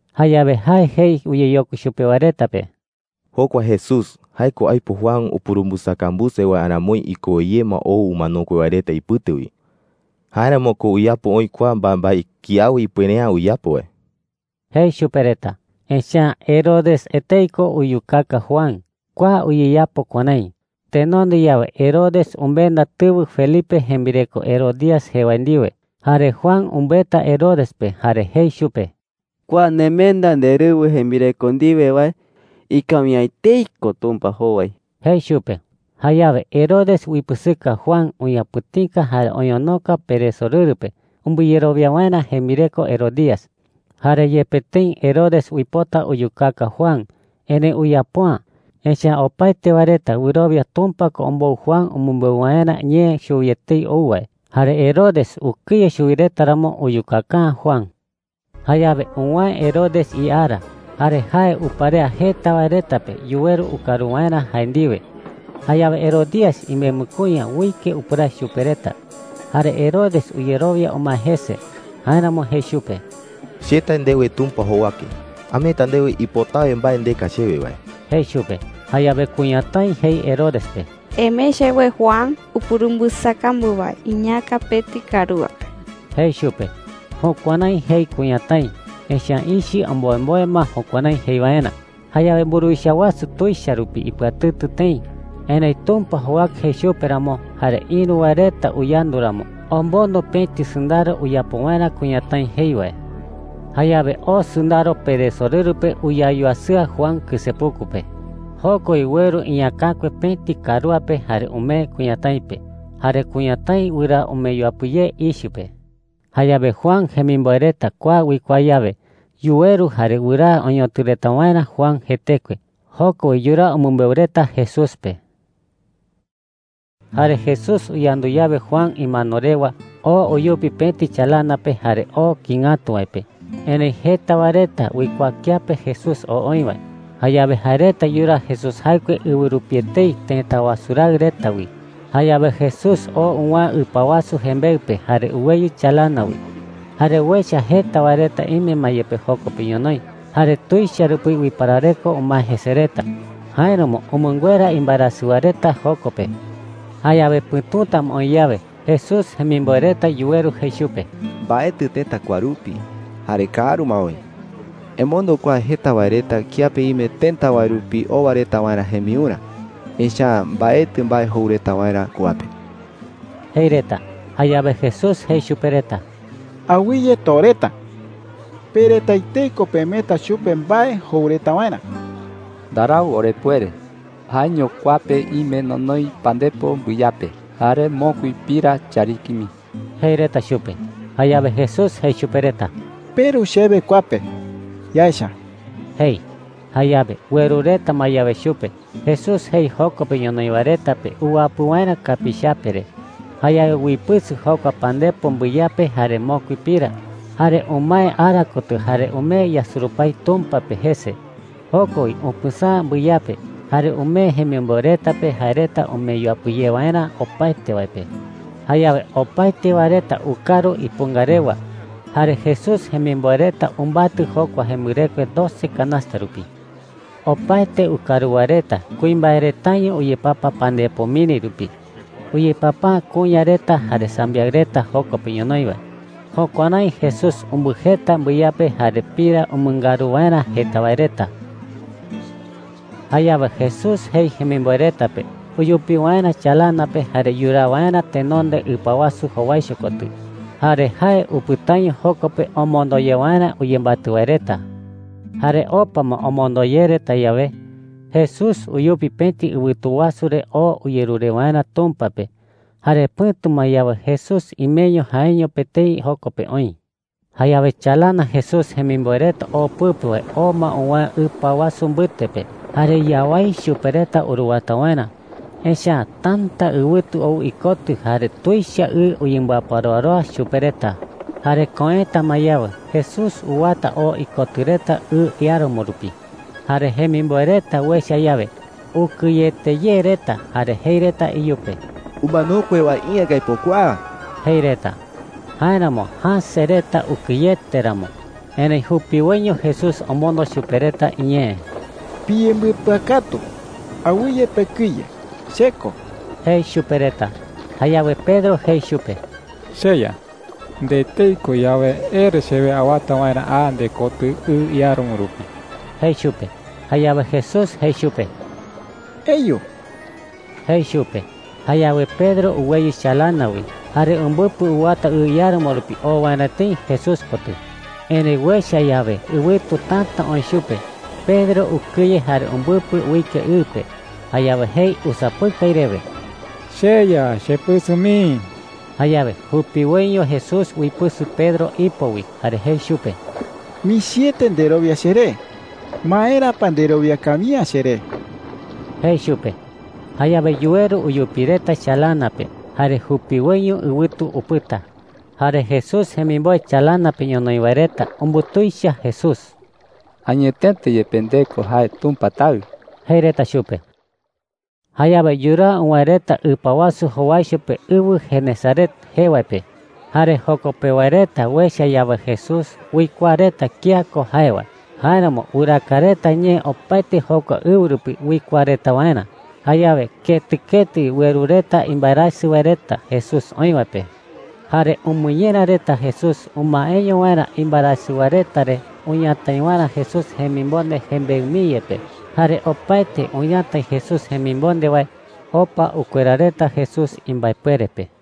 Jayawe jae jei uyeyokui chupe wae reta pe: “Jokua Jesús, jae ko aipo Juan upurumbɨsakambuse wae aramoi ikowe ye ma ou umanokue wae reta ipɨte wi. Jáeramo ko uyapo oï kua mbaembae kiawe ipuere’ä uyapo wae,” jei chupe reta. Echa’ä Herodes etei ko uyukaka Juan. Kua uyeyapo kuärái: Tenonde yawe Herodes umenda tɨwɨ Felipe jembireko Herodías jee wae ndiwe. Jare Juan umbɨeta Herodes pe jare jei chupe: “Kua nemenda nderɨwɨ jembireko ndiwe wae, ikawi’ä etei ko Tumpa jowai,” jei chupe. Jayawe Herodes uipɨsɨka Juan uñapɨ̈tika jare oñonoka peresorɨru pe umbɨyerowia waerä jembireko Herodías. Jare yepe tëi Herodes uipota uyukaka Juan, erëi uyapo’ä. Echa’ä opaete wae reta wɨrowia Tumpa ko ombou Juan umɨmbeu waerä ñee chuwi etei ou wae. Jare Herodes ukɨye chuwi reta ramo, uyukaka’ä Juan. Jayawe uwäe Herodes iara. Jare jae uparea jeta wae reta pe yuweru ukaru waerä jae ndiwe. Jayawe Herodías imembɨ kuña uike upɨrae chupe reta, jare Herodes uyerowia umae jese. Jáeramo jei chupe: “Che tae ndewe Tumpa jowake, ameeta ndewe ipotawe mbae ndeka chewe wae,” jei chupe. Jayawe kuñatái jei Herodes pe: “Emee chewe Juan upurumbɨsakambu wae iñäka pëti karúa pe,” jei chupe. Jukuärái jei kuñatái, echa’ä ichɨ omboemboe ma jukuärái jei waerä. Jayawe mburuwicha wasu tuicha rupi ipɨatɨtɨ tëi. Erëi Tumpa jowake jei chupe ramo, jare ïru wae reta uyandu ramo, omondo pëti sɨndaro uyapo waerä kuñatái jei wae. Jayawe oo sɨndaro peresorɨru pe uyayuasɨa Juan kɨsepuku pe. Joko wi ueru iñäkakue pëti karúa pe jare umee kuñatái pe. Jare kuñatái wɨraa umee yuapɨ ye ichɨ pe. Jayawe Juan jemimboe reta kua uikuaa yawe, yuweru jare wɨraa oñotɨ reta waerä Juan jetekue. Joko wi yuraa umɨmbeu reta Jesús pe. Jare Jesús uyandu yawe Juan imano rewa, oo uyupi pëti chalana pe jare oo kïi ngatu wae pe. Erëi jeta wae reta uikuaa kiape Jesús oo oï wae. Jayawe jae reta yuraa Jesús jaɨkue ɨwɨ rupi etei tëta wasu raɨ reta wi. Jayawe Jesús oo uwäe ɨpa wasu jembeɨ pe jare uweyɨ chalana wi. Jare uecha jeta wae reta ime ma yepe joko pe ñonoï. Jare tuicha rupi uiparareko umae jese reta. Jáeramo umɨnguera imbaerasɨ wae reta joko pe. Jayawe pɨ̈tuta ma oï yawe, Jesús jemimboe reta yuweru jei chupe: “Mbaetɨ tëta kua rupi, jare kaaru ma oï,” jei reta. “Emondo kua jeta wae reta kiape ime tëta wae rupi owa reta waerä jembiurä. Echa’ä mbaetɨ mbae jou reta waerä kua pe,” jei reta. Jayawe Jesús jei chupe reta: “Awɨye too reta,” jei. “Pe reta etei ko pemeeta chupe mbae jou reta waerä,” jei chupe reta. “Ndarau orepuere,” jei reta. “Jaeño kua pe ime nonoi pandepo mbɨyape jare mokui pira chariki mii,” jei reta chupe. Jayawe Jesús jei chupe reta: “Peru chewe kua pe. Yaecha,” jei. Jayawe ueru reta ma yawe chupe, Jesús jei joko pe ñonoï wae reta pe uwapɨ waerä kapiichape re. Jayawe uipɨsɨ jokua pandepo mbɨyape jare mokui pira. Jare umae ara kotɨ jare umee yasurupái Tumpa pe jese. Joko wi upɨsäa mbɨyape, jare umee jemimboe reta pe jae reta umee yuapɨ ye waerä opaete wae pe. Jayawe opaete wae reta ukaru ipunga rewa. Jare Jesús jemimboe reta umbatɨ jokua jembɨrekue doce canasta rupi. Opaete ukaru wae reta kuimbae retaño uyepapa pandepo miri rupi. Uyepapa’ä kuña reta jare sambiaɨ reta joko pe ñonoï wae. Jukuärái Jesús umbɨjeta mbɨyape jare pira umɨngaru waerä jeta wae reta. Jayawe Jesús jei jemimboe reta pe uyupi waerä chalana pe jare yuraa waerä tenonde ɨpa wasu jowaicho kotɨ. Jare jae upɨtaño joko pe omondo ye waerä uyembatɨ wae reta. Jare opa ma omondo ye reta yawe, Jesús uyupi pëti ɨwɨtu wasu re oo uyerure waerä Tumpa pe. Jare pɨ̈tu ma yawe, Jesús imeño jaeño pe etei joko pe oï. Jayawe chalana Jesús jemimboe reta oo pɨpe wae oo ma uwäe ɨpa wasu mbɨte pe. Jare yawái chupe reta uruwata waerä, echa’ä täta ɨwɨtu ou ikotɨ jare tuicha ɨ uyembɨaparoaroa chupe reta. Jare köeta ma yawe, Jesús uwata oo ikotɨ reta ɨ iáramo rupi. Jare jemimboe reta uecha yawe, ukɨyete ye reta jare jei reta iyupe: “¡Umanokue wae iä ko aipo kua!” jei reta. Jáeramo jäse reta ukɨyete ramo. Erëi jupiwoiño Jesús omondo chupe reta iñee: “Piyembɨpɨakatu. Awɨye pekɨye. Che ko,” jei chupe reta. Jayawe Pedro jei chupe: “CheYa, nde etei ko yawe, ere chewe awata waerä a ndekotɨ ɨ iáramo rupi,” jei chupe. Jayawe Jesús jei chupe: “Eyu,” jei chupe. Jayawe Pedro uweyɨ chalana wi, jare umbɨpɨ uwata ɨ iáramo rupi oo waerä tëi Jesús kotɨ. Erëi uecha yawe ɨwɨtu täta oï chupe, Pedro ukɨye jare umbɨpɨ uike ɨ pe. Jayawe jei usapɨkai rewe: “¡CheYa, chepɨsɨ mii!” Jayawe jupiwoiño Jesús uipɨsɨ Pedro ipo wi, jare jei chupe: “Michiete nderowia cheré. ¿Maera pa nderowia kawi’ä cheré?” jei chupe. Jayawe yuweru uyupi reta chalana pe, jare jupiwoiño ɨwɨtu upɨta. Jare Jesús jemimboe chalana pe ñonoï wae reta umbutuicha Jesús. “Añetete yepe nde ko jae Tumpa Taɨ,” jei reta chupe. Jayawe yuraa uwäe reta ɨpa wasu jowaicho pe ɨwɨ Genesaret jee wae pe. Jare joko pewa reta uecha yawe Jesús, uikuaa reta kía ko jae wae. Jáeramo wɨraaka reta ñee opaete jokua ɨwɨ rupi uikuaa reta waerä. Jayawe ketɨ ketɨ wi ueru reta imbaerasɨ wae reta Jesús oï wae pe. Jare umɨñera reta Jesús umaeño waerä imbaerasɨ wae reta re uñatai waerä Jesús jemimonde jembeɨ mii yepe. Jare opaete uñatai Jesús jemimonde wae, opa ukuera reta Jesús imbaepuere pe.